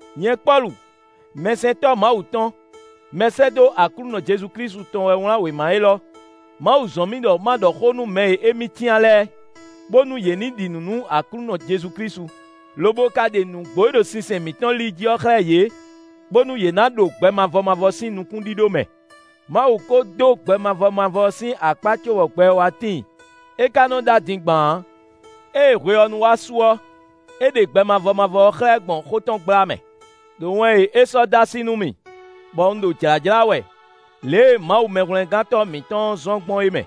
Nyɛ Pɔ́lu, mɛsɛntɔ́ Mawu tɔn, mɛsɛ́dó Aklúnɔ Jezu Klísu tɔn wɛ wlán wěma élɔ́. Mawu zɔ́n mì ɖɔ ma ɖɔ xó nú mɛ e émí cyán lɛ́ɛ, bónú yě ní ɖi nǔ nú Aklúnɔ Jezu Klísu, lobo ka ɖe nǔgbó e ɖo sinsɛn mǐtɔn li jí ɔ́ xlɛ́ yě, bónú yě ná ɖo gbɛ mavɔ mavɔ sín nukúnɖíɖó mɛ. Mawu ko dó gbɛ mavɔ mavɔ ɔ́ sín akpá cóbɔ gbɛ ɔ́ wá tíin; é ka nɔ ɖó adingban ǎ. Ée hwe ɔ́ nu wá su ɔ́, é ɖe gbɛ mavɔ mavɔ ɔ́ xlɛ́ gbɔn xó tɔn gbla mɛ, ɖo wɛn e é sɔ́ dó así nú mì, bɔ un ɖo jlǎjlá wɛ, lě e Mawu Mɛhwlɛ́ngántɔ́ mǐtɔn ɔ́ zɔ́n gbɔn é mɛ.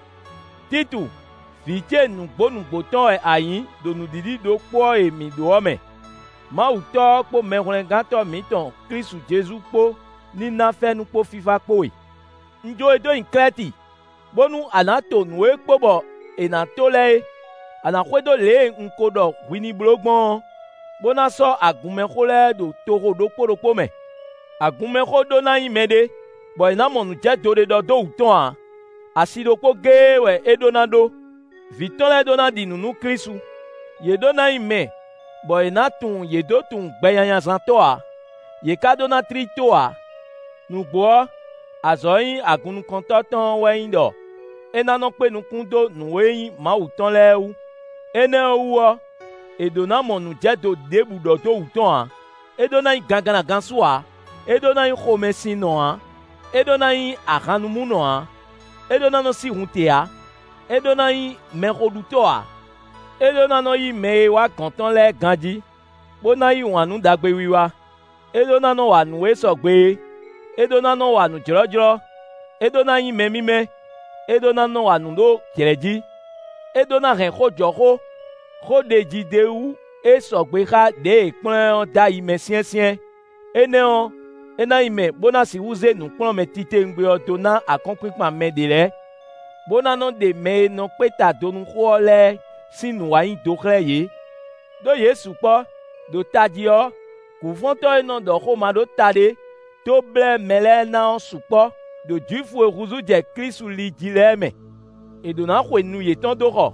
Títu, vǐ ce nǔgbó nǔgbó tɔn wɛ a nyǐ ɖo nǔɖiɖi ɖokpó ɔ́ e mǐ ɖó ɔ́ mɛ. Mawu Tɔ́ ɔ́ kpó Mɛhwlɛ́ngántɔ́ mǐtɔn Klísu Jezu kpó ní ná fɛ́nú kpó fífá kpó we. Un jó we dó nyi Klɛ́ti, bónú a nǎ to nǔ e kpo bɔ è nǎ to lɛ́ɛ é; a nǎ xwedó lě e un ko ɖɔ hwi ní bló gbɔn ɔ́, bó ná sɔ́ agunmɛxó lɛ́ɛ ɖo toxo ɖokpó ɖokpó mɛ. Agunmɛxó ɖó ná nyí mɛɖé, bɔ è nǎ mɔ nǔjɛdo ɖě ɖɔ dó wú tɔn ǎ; asi ɖokpó géé wɛ é ɖó ná ɖó; vǐ tɔn lɛ́ɛ ɖó ná ɖi nǔ nú Klísu; yě ɖó ná nyí mɛ, bɔ è nǎ tunwun yě dó tunwun gbɛnyanyazántɔ́ ǎ, yě ká ɖó ná tlí tó ǎ. Nǔgbó ɔ́, azɔ̌ e nyí agunnukɔntɔ́ tɔn ɔ́ wɛ nyí ɖɔ é ná nɔ kpé nukún dó nǔ e nyí Mawu tɔn lɛ́ɛ wú; énɛ́ ɔ́ wú ɔ́, è ɖǒ ná mɔ nǔjɛdo ɖěbǔ ɖɔ dó wǔ tɔn ǎ, é ɖó ná nyí gangannagansú ǎ; é ɖó ná nyí xomɛsinnɔ ǎ, é ɖó ná nyí ahannumúnɔ ǎ, é ɖó ná nɔ́ sí hun te ǎ, é ɖó ná nyí mɛxoɖutɔ́ ǎ. É ɖó ná nɔ yí mɛ e nɔ wá gɔ̌n tɔn lɛ́ɛ ganjí, bó ná yí wǎn nú ɖagbewiwa; é ɖó ná nɔ wa nǔ e sɔgbe é, é ɖó ná nɔ́ wa nǔ jlɔ́jlɔ́; é ɖó ná nyí mɛ mímɛ́; é ɖó ná nɔ wa nǔ ɖó jlɛ̌ jí. É ɖó ná hɛn xó jɔ xó, xó ɖeji d'é wú e sɔgbe xá ɖěe è kplɔ́n ɛ ɔ́ dó ayi mɛ syɛ́nsyɛ́n; énɛ́ ɔ́, é ná nyí mɛ, bó ná sixú zé nǔkplɔ́nmɛ titewungbe ɔ́ dó ná akɔ́nkpinkpan mɛ ɖě lɛ́ɛ, bó ná nɔ́ ɖe mɛ e nɔ kpé ta do nú xó ɔ́ lɛ́ɛ sín nǔwanyido xlɛ́ yě. Đó yě sukpɔ́, ɖo tají ɔ́, gǔfɔ́ntɔ́ e nɔ ɖɔ xó maɖótaɖé dó blɛ́ mɛ lɛ́ɛ ná ɔ́ sukpɔ́ ɖo Jwifu e húzú jɛ Klísu li jí lɛ́ɛ mɛ. È ɖǒ ná xwe nu yětɔn dó xɔ,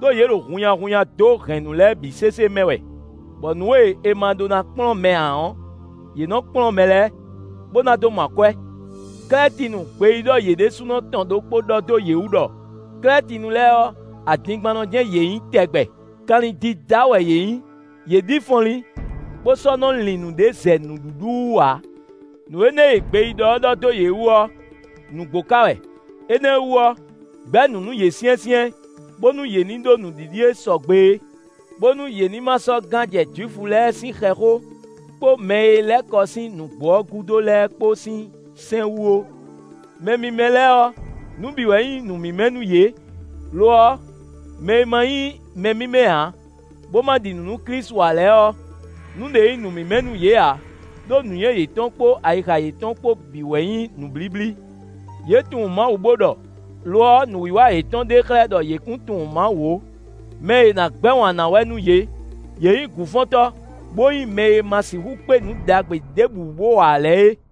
ɖó yě ɖo hunnyahunnya dó hɛ̌nnu lɛ́ɛ bǐ sésé mɛ wɛ, bɔ nǔ e è ma ɖó ná kplɔ́n mɛ ǎ ɔ́, yě nɔ kplɔ́n mɛ lɛ́ɛ, bó ná dó mɔ akwɛ́. Klɛ́tinu gbeyíɖɔ yě ɖésúnɔ tɔn ɖokpó ɖɔ dó yě wú ɖɔ: “Klɛ́tinu lɛ́ɛ ɔ́, adingbannɔ jɛ́n yě nyǐ tɛgbɛ; kanlin dídá wɛ yě nyí; yě ɖi fɔnlín, bó sɔ́ nɔ lin nǔɖé zɛ nǔɖuɖu wú ǎ.” Nǔ énɛ́ e gbeyíɖɔ ɔ́ ɖɔ dó yě wú ɔ́, nǔgbó ka wɛ; énɛ́ wú ɔ́, gbɛ̌ nǔ nú yě syɛ́nsyɛ́n, bónú yě ní ɖó nǔɖiɖi e sɔgbe é, bónú yě ní ma sɔ́ nɔ gán jɛ Jwifu lɛ́ɛ sín xɛxó kpó mɛ e lɛ́ kɔ sín nǔgbó ɔ́ gúdo lɛ́ɛ kpó sín sɛ́n wú ó. Mɛ mímɛ́ lɛ́ɛ ɔ́, nǔ bǐ wɛ nyí nǔ mímɛ́ nú yě. Lo ɔ́, mɛ e ma nyí mɛ mímɛ́ ǎ, bó ma ɖi nǔ nú Klísu ǎ lɛ́ɛ ɔ́, nǔɖé nyí nǔ mímɛ́ nú yě ǎ; ɖó nǔnywɛ́ yětɔn kpó ayixa yětɔn kpó bǐ wɛ nyí nǔblíblí. Yě tunwun Mawu bó ɖɔ; lo ɔ́, nǔwiwa yětɔn ɖe xlɛ́ ɖɔ yě kún tunwun Mawu ó. Mɛ e è nǎ gbɛ́ wǎn ná wɛ nú yě; yě nyí gǔfɔ́ntɔ́, bó nyí mɛ e ma sixú kpé nǔ ɖagbe ɖěbǔ wú bó wa ǎ lɛ́ɛ é.